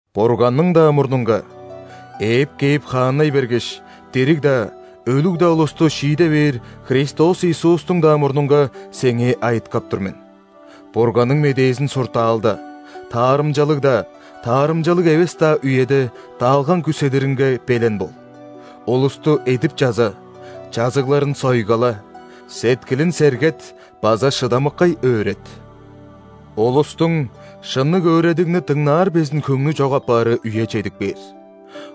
Бурганның-даа мурнунга, ээп кээп хааннай бергеш, дириг-даа, өлүг-даа улусту шииде бээр Христос Иисустуң-даа мурнунга сеңээ айыткап тур мен: Бурганның медээзин суртаалда, таарымчалыг-даа, таарымчалыг эвес-даа үеде даалгаң күүседиринге белен бол, улусту эдип чаза, чазыгларын сойгала, сеткилин сергет база шыдамыккай өөрет. Улустуң шынныг өөредигни дыңнаар безин хөңнү чок апаары үе чедип кээр.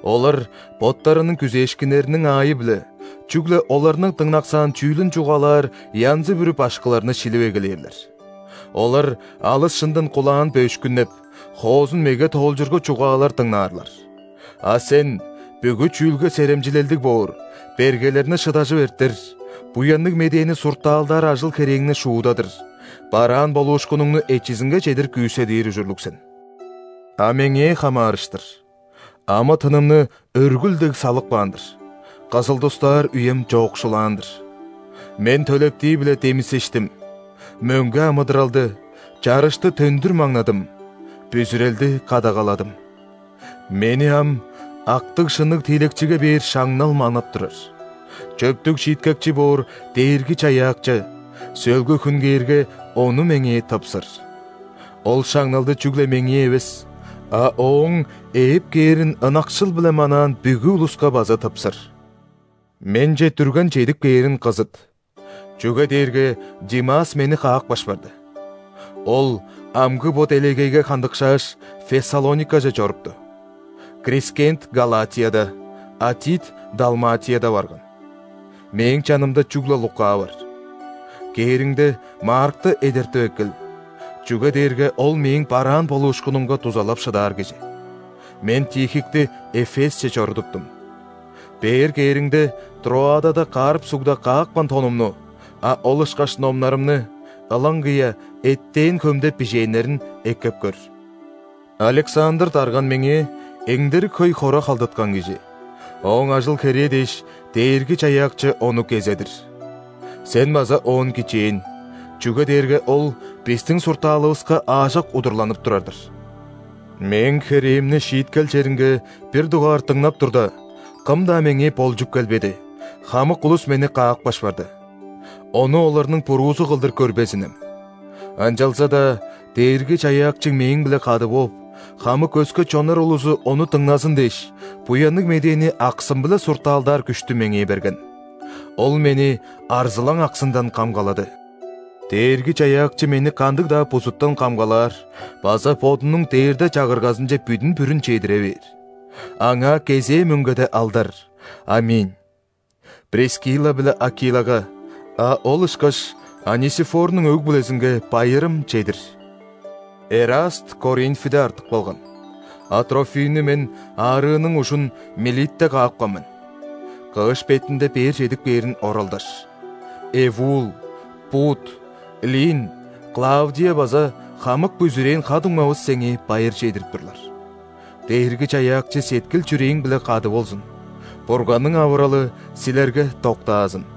Олар боттарының күзээшкиннериниң аайы-биле, чүгле оларның дыңнаксаан чүүлүн чугаалаар янзы-бүрү башкыларны шилип эгелээрлер. Олар алыс шындан кулаан бөөшкүннеп, хоозун меге тоолчургу чугаалар дыңнаарлар. А сен бүгү чүүлге серемчилелдиг боор, бергелерни шыдажып эртер, Буянныг Медээни суртаалдаар ажыл-херээңни шуудадыр, бараан болуушкунуңну эчизинге чедир күүседир ужурлуг сен. А меңээ хамаарыштыр – амы-тынымны өргүл дег салып каан-дыр, кызыл-дустаар үем чоокшулаан-дыр. Мен төлептии-биле демисештим, мөңге амыдыралды, чарышты төндүр маңнадым, бүзүрелди кадагаладым. Мени ам актыг-шынныг тиилекчиге бээр шаңнал манап турар, чөптүг Шииткекчи боор Дээрги-Чаяакчы, сөөлгү хүн кээрге, ону меңээ тыпсыр. Ол шаңналды чүгле меңээ эвес, а Ооң ээп кээрин ынакшыл-биле манаан бүгү улуска база тыпсыр. Менче дүрген чедип кээрин кызыт, чүге дээрге Димас мени каапкаш барды. Ол амгы бо делегейге хандыкшааш, Фессалоникаже чорупту. Крискент – Галатияда, а Тит – Далматияда барган. Мээң чанымда чүгле Лука бар. Кээриңде, Маркты эдертип эккел, чүге дээрге ол мээң бараан болуушкунумга дузалап шыдаар кижи. Мен Тихикти Эфесче чорудуптум. Бээр кээриңде, Троадада Карп сугда каапкан тонумну, а ол ышкаш номнарымны, ылаңгыя эттээн хөмде бижээннерин, эккеп көр. Александр дарган меңээ эңдерик хөй хора халдаткан кижи, ооң ажыл-херээ дээш, Дээрги-Чаяакчы ону кезедир! Сен база оон кичээн, чүге дээрге ол бистиң суртаалывыска аажок удурланып турар-дыр. Мээң херээмни шииткел черинге бир дугаар дыңнап турда, кым-даа меңээ болчуп келбеди, хамык улус мени каапкаш барды. Ону оларның буруузу кылдыр көрбезинем! Ынчалза-даа Дээрги-Чаяакчы мээң-биле кады бооп, хамык өске чоннар улузу ону дыңназын дээш, Буянныг Медээни аксым-биле суртаалдаар күштү меңээ берген. Ол мени арзылаң аксындан камгалады. Дээрги-Чаяакчы мени кандыг-даа бузуттан камгалаар база Бодунуң Дээрде Чагыргазынче бүдүн-бүрүн чедире бээр. Аңаа кезээ мөңгеде алдар! ·Аминь. Прискилла биле Акилага, а ол ышкаш Онисифорнуң өг-бүлезинге байырым чедир. Эраст Коринфиде артып калган, а Трофимни мен аарыының ужун Милитте каапкан мен. Кыш бетинде бээр чедип кээрин оралдаш. Эввул, Пуд, Лин, Клавдия база хамык бүзүрээн ха-дуңмавыс сеңээ байыр чедирип турлар. Дээрги-Чаяакчы сеткил-чүрээң-биле кады болзун! Бурганның авыралы силерге доктаазын!